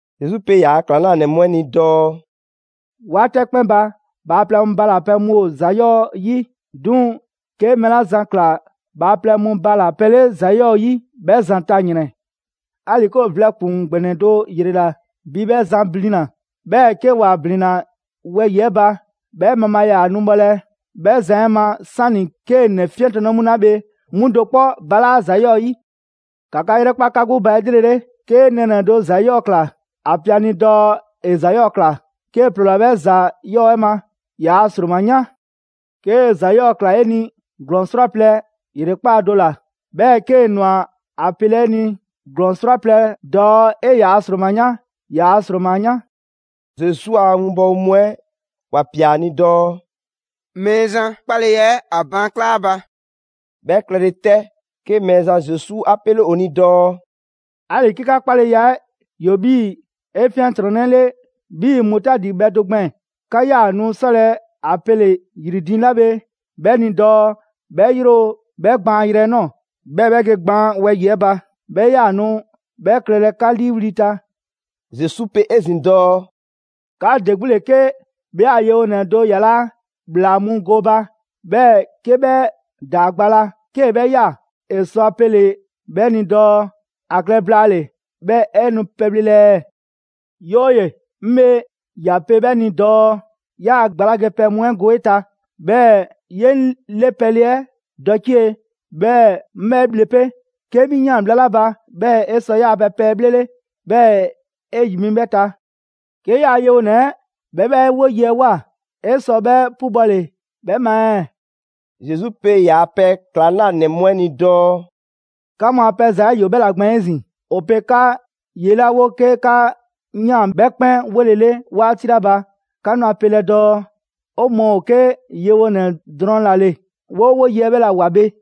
Zesu pe ‑yaa' ‑klaŋlanɛ mu 'ɛ ni dɔɔ: «'Waati 'ɛ 'kpɛn ba, bhaaplɛŋ mu bala‑ pɛ mu ‑o ‑za 'yɔɔ‑ 'yi. 'Duŋ‑ 'ke mɛɛ 'la zan ꞊kla bhaaplɛŋ mu bala‑ pɛ 'le ‑za 'yɔɔ‑ 'yi, 'bhɛ zan ta ‑yrɛn! 'Ali‑ 'ke ‑o vlɛ ‑kpuŋ ‑gbɛnɛ do ‑yrela bi 'bhɛ zan blina‑, 'bhɛɛ‑ 'ke ‑wa ‑blinna wɛyi‑ 'ɛ ba, 'bhɛ mabhaa ‑yaa nu bhɔlɛ 'bhɛ zan 'ɛ ma, 'sani‑ 'kee‑ ‑nɛ 'fiɛntrɔnnɛ mu 'la bhe 'mu do 'kpɔ balaa' ‑za 'yɔɔ‑ 'yi. ‑Ka 'ka 'yrɛkpa 'ka 'gbu ba 'elrele! 'Kee nɛɛnɛ‑ do ‑za 'yɔɔ‑ ꞊kla, ‑a pe ‑a ni dɔɔ ‑e ‑za 'yɔɔ‑ ‑kla. 'Kee‑ ‑ploola 'bhɛ ‑za 'yɔɔ‑ 'ɛ ma, ‑yaa' ‑sroma 'yan. 'Kee‑ ‑za 'yɔɔ‑ ‑kla 'e ni ‑glɔɔn 'srwaplɛ‑ ‑yrekpaa' do ꞊la, 'bhɛɛ‑ 'kee‑ ꞊nwa ‑a pelɛ 'e ni ‑glɔɔn 'srwaplɛ‑ dɔɔ 'e ‑yaa' ‑sroma 'yan, ‑yaa' ‑sroma 'yan.» Zesu a 'winbɔwo mu 'ɛ ‑wa ꞊pia ‑a ni dɔɔ: «Mɛɛzan, 'waa‑ 'kpaleya 'ɛ ‑a baankla' ‑a ba!» 'Bhɛ klɛle 'tɛ, 'ke Mɛɛzan Zesu 'a 'pele ‑o ni dɔɔ: «'Ali‑ 'ke 'ka 'kpaleya 'ɛ ‑yoo bi 'efiɛntrɔnnɛle 'bhii‑ mutaadi bhɛ do gbɛɛn‑, 'ka 'yaa‑ nu 'sɔlɛ‑ a pele‑ ‑yri diiŋ 'la bhe 'bhɛ ni dɔɔ 'bhɛ yro 'bhɛ gbaanyrɛ 'ɛ ꞊nɔɔ, 'bhɛɛ 'bhɛ ge gbaan wɛyi‑ 'ɛ ba. 'Bhɛ ‑yaa nu 'bhɛ klɛlɛ 'ka 'liiwli‑ ta.» Zesu 'pe 'ezin‑ dɔɔ: «'Ka ‑de 'gbu ‑le 'ke 'bhɛ a yewonɛ do yalaa' ‑bhlaa mu gooba, 'bhɛɛ‑ 'ke 'bhɛ ‑daa gba la, 'kee‑ 'bhɛ ꞊ya, ‑e sɔ ‑a pele‑ 'bhɛ ni dɔɔ: ‹‑A klɛ blaale‑ 'bhɛɛ‑ 'e nu pɛbhlelɛ ɛɛ?› 'Yooye‑, 'ŋ bhe ꞊ya pe 'bhɛ ni dɔɔ: ‹'Yaa‑ gba la ge pɛ mu 'ɛ go 'e ta, 'bhɛɛ‑ 'ye 'ŋ 'le pɛle 'ɛ dɔcie‑, 'bhɛɛ‑ 'ŋ 'bhɛ bhle 'pe. 'Kee‑ 'mi ꞊yaan bhla 'la ba; 'bhɛɛ‑ 'e sɔ 'yaa‑ pɛ pɛ 'ɛ 'bhlele, 'bhɛɛ‑ 'e ‑yi mi 'bhɛ ta.› 'Ke 'yaa‑ yewonɛ 'bhɛ 'bhɛ 'woye‑ 'ɛ ꞊woa, 'e sɔ 'bhɛ 'pubɔle 'bhɛ ma ɛɛ?» Zesu pe ‑yaa' pɛ ‑klaŋlanɛ mu 'ɛ ni dɔɔ: «'Ka mu a pɛ ‑za 'ɛ ‑yoo 'bhɛ ‑la gbɛɛn‑ 'ezin‑. ‑O pe 'ka ye 'la 'wo 'ke 'ka ꞊yaan 'bhɛ 'kpɛn 'wolele 'waati 'la ba, 'ka nu ‑a pelɛ dɔɔ: ‹'O mɔɔ ‑o 'ke yewonɛ drɔŋ ‑la ‑le; 'woo 'woye‑ 'ɛ 'bhɛla‑ ꞊woa bhe.›»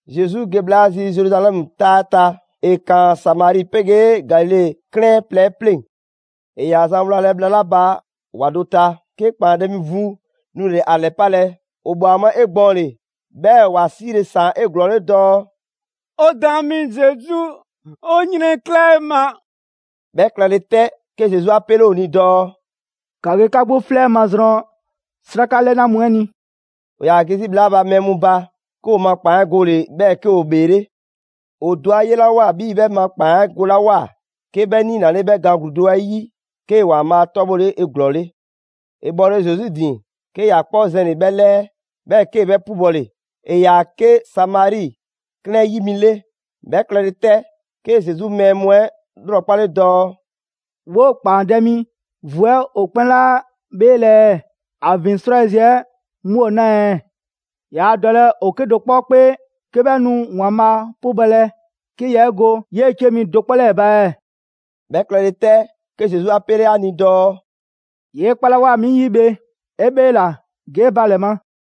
Zesu ge bhla zi Zeruzalɛmu 'taa 'ɛ ta, ‑e ‑kaan Samari 'pegee Galile 'klɛɛn plɛ 'ɛ 'pleŋ‑. ‑E ‑yaa zan wlalɛ bhla 'la ba ‑wa do ta, 'ke ‑kpaandɛ' mi vu nule‑ ‑a ‑lɛpalɛ. ‑O ꞊bwa ‑a ma 'egbɔɔnle, 'bhɛɛ‑ ‑wa 'siile ‑saan 'eglɔɔle dɔɔ: «'O Daan mi Zesu, 'o 'yrɛnkla 'e ma!» 'Bhɛ klɛle 'tɛ, 'ke Zesu 'a 'pele ‑o ni dɔɔ: «‑Ka ge 'ka 'gbu 'flɛ mazrɔn 'sraka 'lɛna mu 'ɛ ni.» ‑O ‑yaa ge 'zi bhla 'la ba 'bhɛ mu ba, 'ke ‑o ma ‑kpaan 'ɛ gole‑, 'bhɛɛ‑ 'ke ‑o ‑bheele'. ‑O do 'a 'yelawoa 'bhii‑ 'bhɛ ma ‑kpaan 'ɛ golawoa, 'ke 'bhɛ niinale 'bhɛ gaan ‑gluu do 'ɛ 'yi 'kee‑ ‑Waanbhaa' 'tɔbhɔle 'eglɔɔle. ‑E bhɔle Zesu ‑din, 'ke ‑ya 'kpɔ zɛnle‑ 'bhɛ 'lɛɛ, 'bhɛɛ 'kee‑ 'bhɛ 'pubɔle. ‑E ‑yaa 'ke Samari 'klɛɛn 'ɛ 'yi mi 'le. 'Bhɛ klɛle 'tɛ, 'ke Zesu mɛɛ mu 'ɛ 'lrɔkpale dɔɔ: «'Woo‑ ‑kpaandɛ' mi vu 'ɛ, ‑o 'kpɛn 'laa 'bheelɛ‑ ɛɛ? ‑A ‑vin 'srwayiziɛ 'mu ‑o 'naa ɛɛ? Yaa dɔlɛ ‑o 'kedo‑ 'kpɔ 'kpee 'ke 'bhɛ nu ‑Waanbhaa' 'pubɔlɛ 'ke yaa 'e go 'yee‑ 'cie mi do 'kpɔ 'lɛɛ‑ ba ɛɛ?» 'Bhɛ klɛle 'tɛ, 'ke Zesu 'a 'pele ‑a ni dɔɔ: «'Yee 'kpalawoa 'mi 'yi bhe 'e 'bheela‑, ge 'e ba ‑lɛ ma.»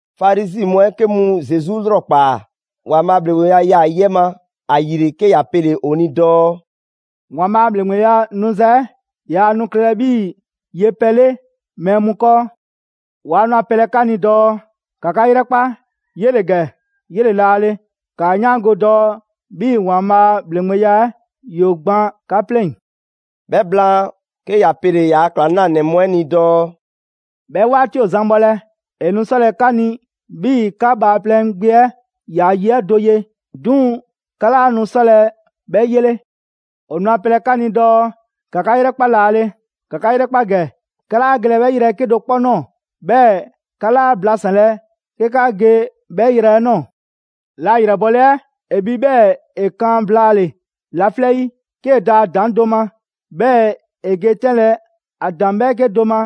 Farizi mu 'ɛ 'ke mu Zesu 'lrɔkpaa‑ ‑Waanbhaa' a ‑bhleŋgbeya 'yaa‑ yi 'ɛ ma. ‑Ayile, 'ke ‑ya pele‑ ‑o ni dɔɔ: «‑Waanbhaa' ‑bhleŋgbeya 'nuza‑ 'ɛ yaa nu klɛlɛ 'bhii‑ yepɛ 'le mɛɛ mu 'kɔɔ. Waa nu a pelɛ 'ka ni dɔɔ: ‹‑Ka 'ka 'yrɛkpa, 'yele‑ ‑gɛ! 'Yele‑ 'laale‑.› ‑Kaa 'yaango‑ dɔɔ 'bhii‑ ‑Waanbhaa' a ‑bhleŋgbeya 'ɛ ‑yoo gban 'ka 'pleŋ‑.» 'Bhɛ blaan, 'ke ‑ya pele‑ ‑yaa' ‑klaŋlanɛ mu 'ɛ ni dɔɔ: «'Bhɛ 'waati ‑o zan bhɔlɛ, ‑e nu 'sɔlɛ‑ 'ka ni 'bhii‑ 'ka Bhaaplɛŋ Gbe 'ɛ ‑yaa' yi 'ɛ do ye. 'Duŋ‑ 'ka 'laa nu 'sɔlɛ‑ 'bhɛ 'yele. ‑O nu ‑a pelɛ 'ka ni dɔɔ: ‹‑Ka 'ka 'yrɛkpa laale, ‑ka 'ka 'yrɛkpa ‑gɛ›. 'Ka 'laa gelɛ 'bhɛ yrɛ 'ɛ 'kedo‑ 'kpɔ ꞊nɔɔ, 'bhɛɛ‑ 'ka 'laa blasanlɛ 'ke 'ka ge 'bhɛ yrɛ 'ɛ ꞊nɔɔ. La ‑yrɛbole 'ɛ ‑e bhi 'bhɛɛ‑ ‑e kan blaale‑ laflɛ' 'yi, 'kee‑ da ‑a ‑daŋ' do ma, 'bhɛɛ‑ ‑e ge 'tɛnlɛ‑ ‑a ‑daŋ' 'bhɛɛke do ma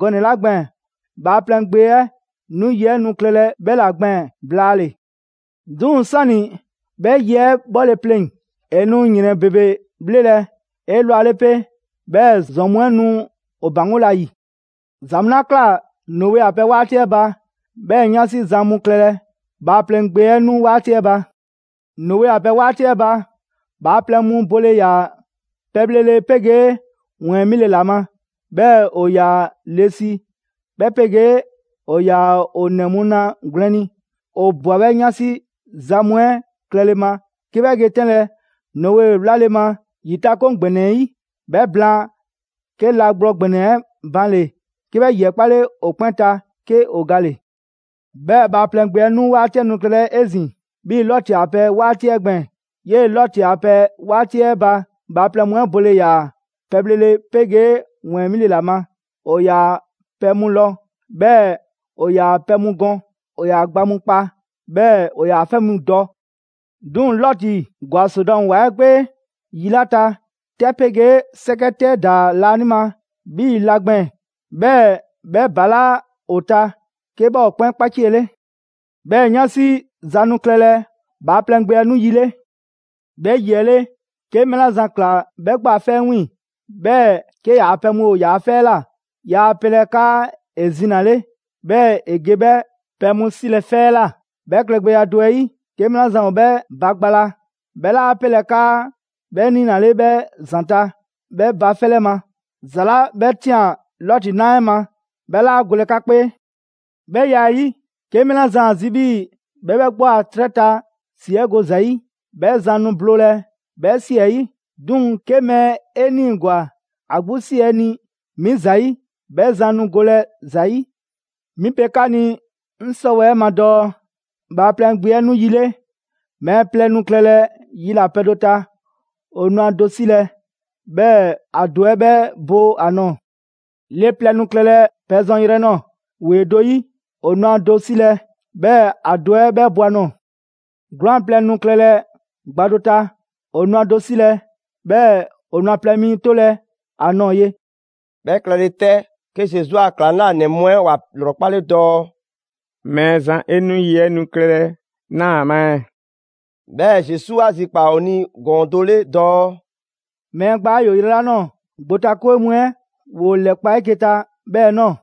gɔnɛ‑ 'la gbɛɛn‑, Bhaaplɛŋ Gbe 'ɛ nu yi 'ɛ nu klɛlɛ 'bhɛ ‑la gbɛɛn‑ blaale‑. 'Duŋ‑ 'sani‑ 'bhɛ yi 'ɛ 'bhɔle‑ pleŋ‑, ‑e nu ‑yrɛn ‑bebe 'bhlelɛ‑ 'elwale 'pe, 'bhɛɛ‑ ‑zɔn mu 'ɛ nu ‑o ‑baŋgolɛ ‑a ‑yi. ‑Za mu 'la ꞊kla Noe a pɛ 'waati 'ɛ ba, 'bhɛɛ‑ 'yansi za mu klɛlɛ Bhaaplɛŋ Gbe 'ɛ 'nu 'waati 'ɛ ba. Noe a pɛ 'waati 'ɛ ba, bhaaplɛŋ mu bole ‑yaa pɛbhlele 'pegee ‑wɛɛn 'mile ‑la ma. 'Bhɛɛ‑ ‑o ‑yaa le si 'bhɛ 'pegee ‑o ‑yaa ‑o ‑nɛ mu na gwlɛn ni. ‑O ꞊bwa 'bhɛɛ‑ 'yansi za mu 'ɛ klɛle ma 'kɛ 'bhɛ ge 'tɛnlɛ‑ Noe 'wlale‑ ma ‑yitakoŋ ‑gbɛnɛ 'ɛ 'yi. 'Bhɛ blaan, 'ke la gblɔ ‑gbɛnɛ 'ɛ banle‑ 'ke 'bhɛ 'yi 'ɛ 'kpale ‑o 'kpɛn ta, 'ke ‑o gale. 'Bhɛɛ‑ Bhaaplɛŋ Gbe 'ɛ 'nu 'waati 'ɛ nu klɛlɛ 'ezin‑ 'bhii‑ Lɔti a pɛ 'waati 'ɛ gbɛɛn‑. 'Yee‑ Lɔti a pɛ 'waati 'ɛ ba, bhaaplɛŋ mu 'ɛ bole ‑yaa pɛbhlele 'pegee ‑wɛɛn 'mile‑ ‑la ma. ‑O ‑yaa pɛ mu lɔ, 'bhɛɛ‑ ‑o ‑yaa pɛ mu gɔn. ‑O ‑yaa gba mu kpa, 'bhɛɛ‑ ‑o ‑yaa 'fɛ mu dɔ. 'Duŋ‑ Lɔti ‑gwa Sodɔmu ‑wa 'ɛ 'kpee yi 'la ta, 'tɛ 'pegee 'sɛkɛ 'tɛ ‑daa laanima 'bhii‑ la gbɛɛn‑, 'bhɛɛ‑ 'bhɛ ‑balaa' ‑o ta, 'ke 'bhɛ ‑o 'kpɛn 'kpaciele.» 'Bhɛɛ‑ 'yansi za nu klɛlɛ Bhaaplɛŋ Gbe 'ɛ 'nu yi 'le. «'Bhɛ yi 'ɛ 'le, 'ke mɛɛ 'la zan ꞊kla 'bhɛ 'gbu a 'fɛ 'ɛ 'wiiŋ‑, 'bhɛɛ 'ke ‑yaa' pɛ mu ‑o yaa 'fɛ 'ɛ ꞊la, yaa pelɛ 'kaa ‑e zinale, 'bhɛɛ‑ ‑e ge 'bhɛ pɛ mu 'silɛ‑ 'fɛ 'ɛ ꞊la. 'Bhɛ klɛgbɛya do 'ɛ 'yi, 'ke mɛɛ 'la zan ‑o 'bhɛ ba gba la, 'bhɛ 'laa pelɛ 'kaa 'bhɛ niinale 'bhɛ ‑zanta' 'bhɛ ba 'fɛ 'lɛ ma. ‑Za 'la 'bhɛ ꞊tian Lɔti na 'ɛ ma, 'bhɛ 'laa golɛ 'ka 'kpee. 'Bhɛ ya 'ɛ 'yi, 'ke mɛɛ 'la zan ‑a zi 'bhii‑ 'bhɛ 'bhɛ 'gbu a 'trɛ ta 'si 'ɛ go ‑za 'yi, 'bhɛ zan nu bloolɛ 'bhɛ 'si 'ɛ 'yi. 'Duŋ‑ 'ke mɛɛ 'e 'niigwa‑ ‑a 'gbu 'si 'ɛ ni 'mi ‑zayi', 'bhɛ zan nu golɛ ‑za 'yi. 'Mi pe 'ka ni 'ŋ 'sɔwɛɛ‑ 'ɛ ma dɔɔ: Bhaaplɛŋ Gbe 'ɛ 'nu yi 'le, mɛɛ plɛ nu klɛlɛ yilapɛ do ta, ‑o nu ‑a do 'silɛ‑ 'bhɛɛ‑ ‑a do 'ɛ 'bhɛ bo ‑a nɔɔ‑. Le plɛ nu klɛlɛ pɛ zɔn yrɛ nɔɔ‑ ‑wee do 'yi, ‑o nu ‑a do 'silɛ‑, 'bhɛɛ‑ ‑a do 'ɛ 'bhɛ bo ‑a nɔɔ‑. ['Gwlaan‑ plɛ nu klɛlɛ gba do ta, ‑o nu ‑a do 'silɛ‑, 'bhɛɛ‑ ‑o nu ‑a plɛ mi 'tolɛ‑ ‑a nɔɔ ye.»] 'Bhɛ klɛle 'tɛ, 'ke Zesu a ‑Klaŋlanɛ mu 'ɛ ‑wa ‑lrɔkpale dɔɔ: «Mɛɛzan, 'e nu yi 'ɛ nu klɛlɛ 'naa‑ ‑a ma ɛɛ?» 'Bhɛɛ‑ Zesu 'a zikpaa‑ ‑o ni ‑gɔɔn do 'le dɔɔ: «Mɛɛ gbaa 'ɛ ‑yoo yrɛ 'la ꞊nɔɔ, gbotakwe mu 'ɛ ‑woo ‑lɛkpa' 'eke‑ ta 'bhɛɛ‑ ꞊nɔɔ.»